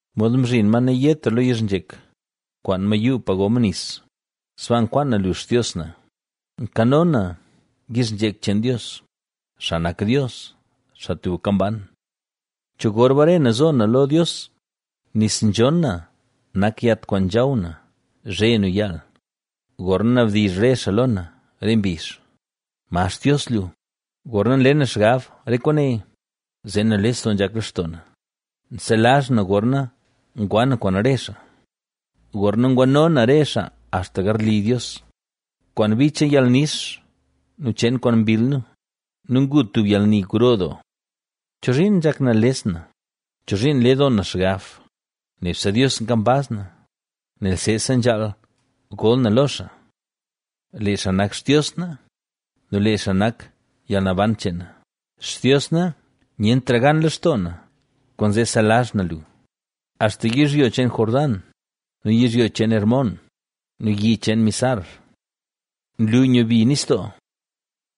Mod mzhin ma nayetra lo yizhnzhek, nkwaan ma yuu pa go ma nis, sbaa nkwaan na lu, Xtios na. Nkano na yizhnzhek cheen Dios, xaa nak Dios, xaa tubka mban. ¿Cho gor bare na zo na lo Dios? Nis nzhon na nak yat kwaan nzhaw na zhe nu yaal, gorna nabdizh re xaa lo na re mbizh: “¿Ma Xtios lu?” Gorna nle na xgab re kwaane, zee nales doo nzhak lextoo na; nselazh na gorna ngwa na kwaan re xaa, gorna ngwano na re xaa axta garli Dios, kwaan bi cheen yalnix nu cheen kwaan mbill nu nu ngu nu tub yalni gro doo. ¿Chozhiin nzhak nales na? ¿Chozhiin nle doo na xgab? Nebse Dios nkambaz na, nel seesa nzhaal gol na lo xaa. ¡Lee xaa nak Xtios na! ¡Nu lee xaa nak yalnaban cheen na! Xtios na, nyentra gan lextoo na, kwaanzee nselazh na lu; axta yizhyo cheen Jordán, nu yizhyo cheen Hermón, nu yi cheen Mizar. Nlu nyubi nistoo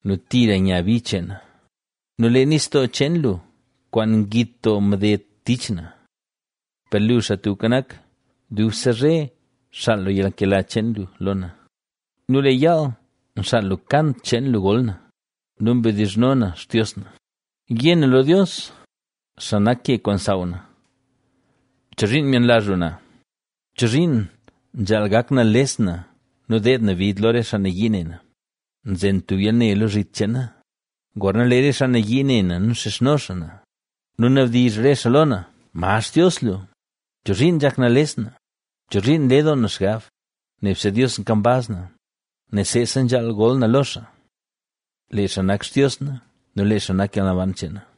nu tira nya bi cheena nu lee nistoo cheen lu kwaan ngit doo mded tich na. Per lu, Xaa Tubka Nak, dubse zhe xaal lu yalnkela cheen lu lo na nu lee yaal nxaal lu kant cheen lu gol na nu mdizhno na Xtios na. Yé na lo Dios, xaa nak ke kwaan nsaaw na: “¿Chozhiin myenlazh lu na? ¿Chozhiin nzhaal gak nales na nu deed na bid lo re xaa nayii ne na?” Nzen tub yalne lo zhit cheen na, gorna lee re xaa nayii ne na nu nxizhno xaa na, nu nabdizh re xaa lo na: “¿Ma Xtios lu?” ¿Chozhiin nzhak nales na? ¿Chozhiin nle doo na xgab? Nebse Dios nkambaz na, nel seesa nzhaal gol na lo xaa. ¡Lee xaa nak Xtios na! ¡Nu lee xaa nak yalnaban cheen na!